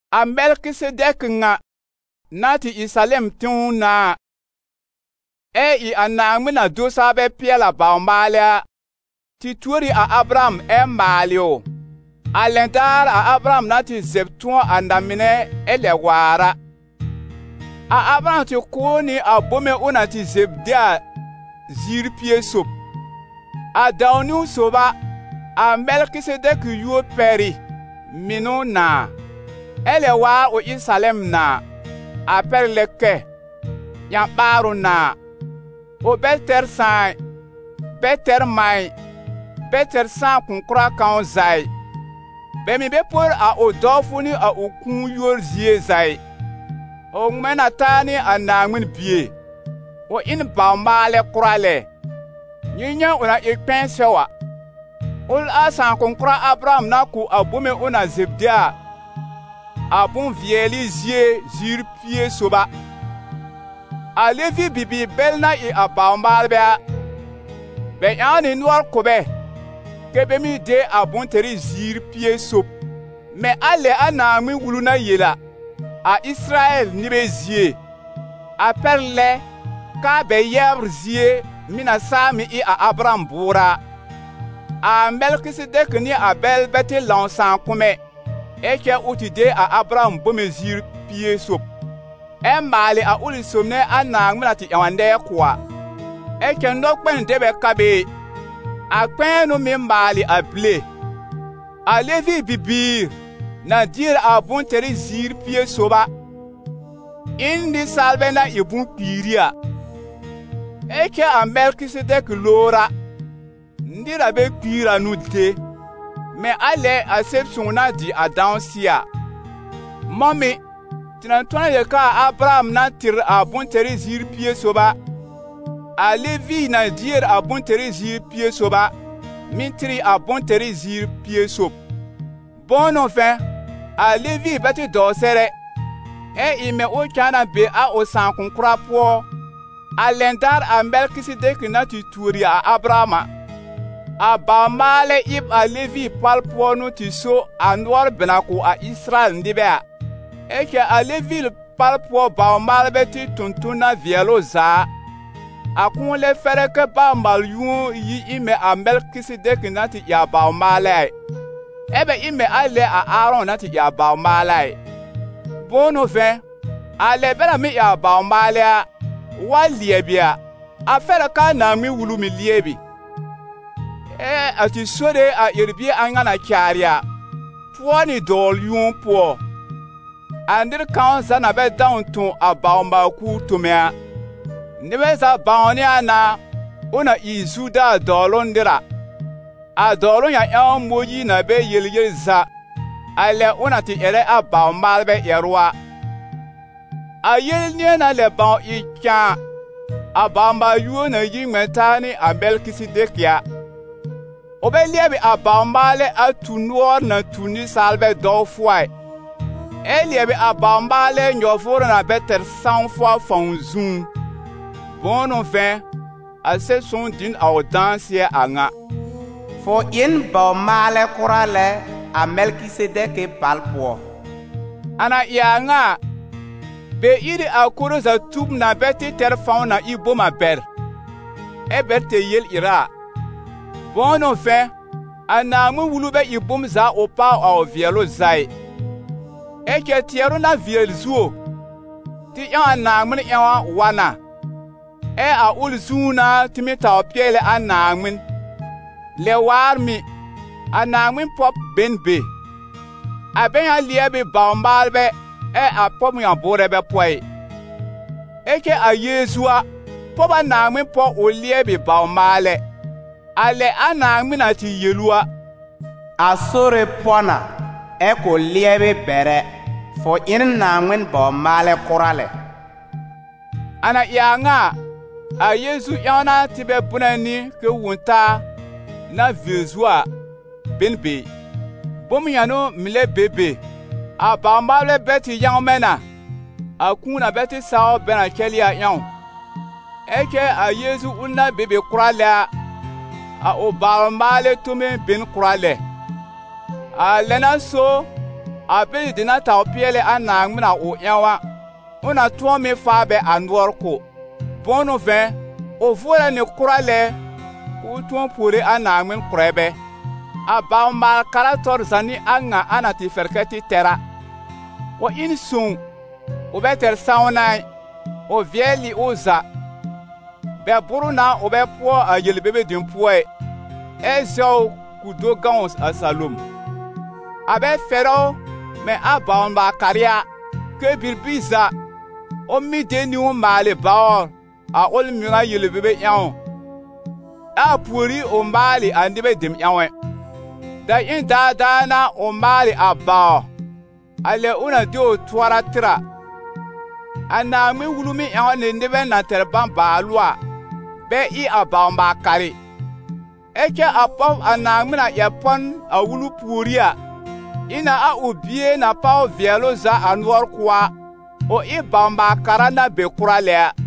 A Mɛlkɩsedɛkɩ ŋa, na tɩ ɩ Salɛm tẽw nãà ɛ ɩ a Naaŋmɩn-na-do-saa-bɛ-pɩɛl-a bawr-maalɛ a, tɩ tuor ɩ a Abraham ɛ maalɩ ʋ, a lɛn daar a Abraham na tɩ zɛb tʋ̃ɔ a na-mɩnɛ ɛ lɛb waar a. A Abraham tɩ kʋ̀ ʋ nɩ a bome ʋ na zɛb de a ziir pie sob. A dãw-niwn sob a, a Mɛlkɩsedɛkɩ yúor pɛr ɩ: «Mɩnʋ nãà», ɛ lɛb waar, ʋ ɩ Salɛm nãà, a pɛr lɛ kɛ: «Ƴã-ɓaarʋ nãà». Ʋ bɛ tɛr sãà ɩ, bɛ tɛr mã ɩ, bɛ tɛr sãakʋ̃-kʋra kãw za ɩ; bɛ mɩ̀ bɛ por a ʋ dɔwfʋ nɩ a ʋ kũu yúor zie za ɩ. Ʋ ŋmɛ̃ na taa nɩ a Naaŋmɩn Bie: ʋ ɩ n bawr-maalɛ kʋra lɛ. Nyɩ nyɛ̃ ʋ na ɩ kpɛ̃ɛ sɛw a! Ʋl a sãakʋ̃-kʋra Abraham na kʋ̀ a bome ʋ na zɛb de a, a bʋ̃-vɩɛlɩ zie ziir pie sob a! A Levi bibiir bɛl na ɩ a bawr-maalbɛ a, bɛ ƴãw nɩ nʋɔr kʋ̀ bɛ, kɛ́ bɛ mɩ́ de a bʋ̃-tɛrɩ ziir pie sob, mɛ̃ a lɛ a Naaŋmɩn-Wulu na yel a, a Ɩsɩrayɛl nɩbɛ zie, a pɛr lɛ k'aa bɛ yɛbr zie, mɩ̀ na saa mɩ̀ ɩ a Abraham bʋʋrɛ a. A Mɛlkɩsedɛkɩ nɩ a bɛl bɛ tɩ lãw sãakʋm ɛ, ɛ cɛ ʋ tɩ de a Abraham bome ziir pie sob, ɛ maalɩ a sob nɛ a Naaŋmɩn na tɩ ƴãw a nɛɛ kʋ̀ a. Ɛ cɛ nɔkpɛn dɛ bɛ ka be ɩ, a kpɛ̃ɛ n'ʋ mɩ́ maalɩ a bile. A Levi bibiir, na dier a bʋ̃-tɛrɩ ziir pie sob a, ɩ n nɩsaalbɛ na ɩ bʋ̃-kpiiri a; ɛ cɛ a Mɛlkɩsedɛkɩ lowr a, nɩr na bɛ kpiir a n'ʋ de, mɛ̃ a lɛ a Sɛb-sõw na dɩ a dãsɩɛ a. Mɔ̃ mɩ̀, tɩ na tʋ̃ɔ na yel k'aa Abraham na tɩr a bʋ̃-tɛrɩ ziir pie sob a, a Levi na dier a bʋ̃-tɛrɩ ziir pie sob a, mɩ̀ tɩr ɩ a bʋ̃-tɛrɩ ziir pie sob. Bʋ̃ʋ n'ʋ vɛ̃, a Levi bɛ tɩ dɔw sɛr ɛ, ɛ ɩ mɛ̃ ʋ cãa na be a ʋ sãakʋ̃-kʋra pʋɔ, a lɛn daar a Mɛlkɩsedɛkɩ na tɩ tuori a Abraham a. A bawr-maalɛ ɩb a Levi pal pʋɔ n'ʋ tɩ so a nʋɔr bɛ na kʋ̀ a Ɩsɩrayɛl nɩbɛ a. Ɛ cɛ a Levi pal pʋɔ bawr-maalbɛ tɩ tõ ton na vɩɛl ʋ za a, a kʋ̃ʋ lɛ fɛrɛ kɛ́ baw-maal-yũo yi ɩ mɛ̃ a Mɛlkɩsedɛkɩ na tɩ ɩ a bawr-maalɛ a ɩ, ɛ bɛ ɩ mɛ̃ a lɛ a Aarɔ̃ na tɩ ɩ a bawr-maalɛ a ɩ. Bʋ̃ʋ n'ʋ vɛ̃, a lɛ bɛ na mɩ́ ɩ a bawr-maalɛ a, wa lɩɛbɩ a, a fɛr a k'aa Naaŋmɩn-Wulu mɩ̀ lɩɛbɩ. Ɛ a tɩ Sore, a ƴɛr-bie a ŋa na caarɩ a, pʋɔ nɩ dɔwl-yũo pʋɔ, a nɩr kãw za na bɛ dãw tõ a bawr-maal-kuur tome a. Nɩbɛ za bãwnɩ a na ʋ na ɩ Zuda dɔwlʋ nɩr a, a dɔwlʋ ŋa ƴãw Mõyiir na bɛ yel yel za, a lɛ ʋ na tɩ ƴɛrɛ a bawr-maalbɛ ƴɛrʋ a. A yele nɩ̃ɛ na lɛ bãw ɩ cãa, a baw-maal-yũo na yi ŋmɛ̃ taa nɩ a Mɛlkɩsedɛkɩ a, ʋ bɛ lɩɛbɩ a bawr-maalɛ a tu nʋɔr na tu nɩsaalbɛ dɔwfʋ a ɩ, ɛ lɩɛbɩ a bawr-maalɛ nyɔ-vʋʋrʋ na bɛ tɛr sãwfʋ a fãw zũú. Bʋ̃ʋ n'ʋ vɛ̃, a Sɛb-sõw dɩ n a ʋ dãsɩɛ a ŋa: «Fʋ ɩ n bawr-maalɛ kʋra lɛ a Mɛlkɩsedɛkɩ pal pʋɔ.» A na ɩ a ŋa a, bɛ ír ɩ a koro za tub na bɛ tɩ tɛr fãw na ɩ bom a bɛr, ɛ́ bɛ tɛr yel-ɩra a. Bʋ̃ʋ n'ʋ vɛ̃, a Naaŋmɩn-Wulu bɛ ɩ bom za ʋ páw a ʋ vɩɛlʋ za ɩ. Ɛ cɛ tɩɛrʋ na vɩɛl zuo, tɩ ƴãw a Naaŋmɩn ƴãw a, wa na, ɛ a ʋl zũú n'a tɩ mɩ́ tawr pɩɛlɛ a Naaŋmɩn. Lɛ waar mɩ̀, a Naaŋmɩn pɔb be n be. A bɛ ŋa lɩɛb ɩ bawr-maalbɛ, ɛ a pɔb ŋa bʋʋrɛ bɛ pɔ ɩ. Ɛ cɛ a Yeezu a, pɔb a Naaŋmɩn pɔ ʋ lɩɛbɩ bawr-maalɛ, a lɛ a Naaŋmɩn na tɩ yel ʋ a: «A Sore pɔ na, ɛ kʋ̃ lɩɛbɩ bɛr ɛ: fʋ ɩ n Naaŋmɩn bawr-maalɛ kʋra lɛ.» A na ɩ a ŋa a, a Yeezu ƴãw n'a tɩ bɛ bʋnɛ nɩ kɛ Wõ-taa, na vɩɛl zuo a, be n be ɩ. Bom ŋa n'ʋ mɩ̀ lɛ be be, a bawr-maalbɛ bɛl tɩ yãwmɛ n'a, a kũu na bɛ tɩ sawr bɛ na cɛlɩ a ƴãw. Ɛ cɛ a Yeezu ʋl na be be kʋra lɛ a, a ʋ bawr-maalɛ tome be n kʋra lɛ. A lɛ n'a so, a bɛlɩ dem na tawr pɩɛlɛ a Naaŋmɩn a ʋ ƴãw a, ʋ na tʋ̃ɔ mɩ́ faa bɛ a nʋɔr kʋ̀. Bʋ̃ʋ n'ʋ vɛ̃, ʋ vʋʋrɛ nɩ kʋra lɛ k'ʋʋ tʋ̃ɔ puore a Naaŋmɩn kʋ̀rɛ bɛ. A bawr-maal-kara tɔr za n'ɩ a ŋa a na tɩ fɛr kɛ tɩ tɛr a: ʋ ɩ n sõw, ʋ bɛ tɛr sãwna ɩ, ʋ vɩɛl ɩ ʋ za; bɛ bʋ́r ʋ na ʋ bɛ pʋɔ a yel-bebe dem pʋɔ ɩ, ɛ zɛw ʋ k'ʋ do gãw a salom. A bɛ fɛrɛ ʋ mɛ̃ a baw-maal-karɩ a, kɛ́ bibir za, ʋ mɩ́ de niwn maalɩ bawr a ʋl mɩŋa yel-bebe ƴãw, ɛ a pùorí ʋ maalɩ a nɩbɛ dem ƴãw ɛ. Daƴẽn daadaa n'a ʋ maalɩ a bawr, a lɛ ʋ na de ʋ tʋɔra tɩr a. A Naaŋmɩn-Wulu mɩ́ ƴãw nɩ nɩbɛ na tɛr bãbaalʋ a, bɛ ɩ a baw-maal-karɩ; ɛ cɛ a pɔb a Naaŋmɩn na ƴɛr pɔ n, a Wulu pùorí a, ɩ na a ʋ Bie na páw vɩɛlʋ za a nʋɔr kʋ̀ a, ʋ ɩ bawr-maal-kara na be kʋra lɛ a.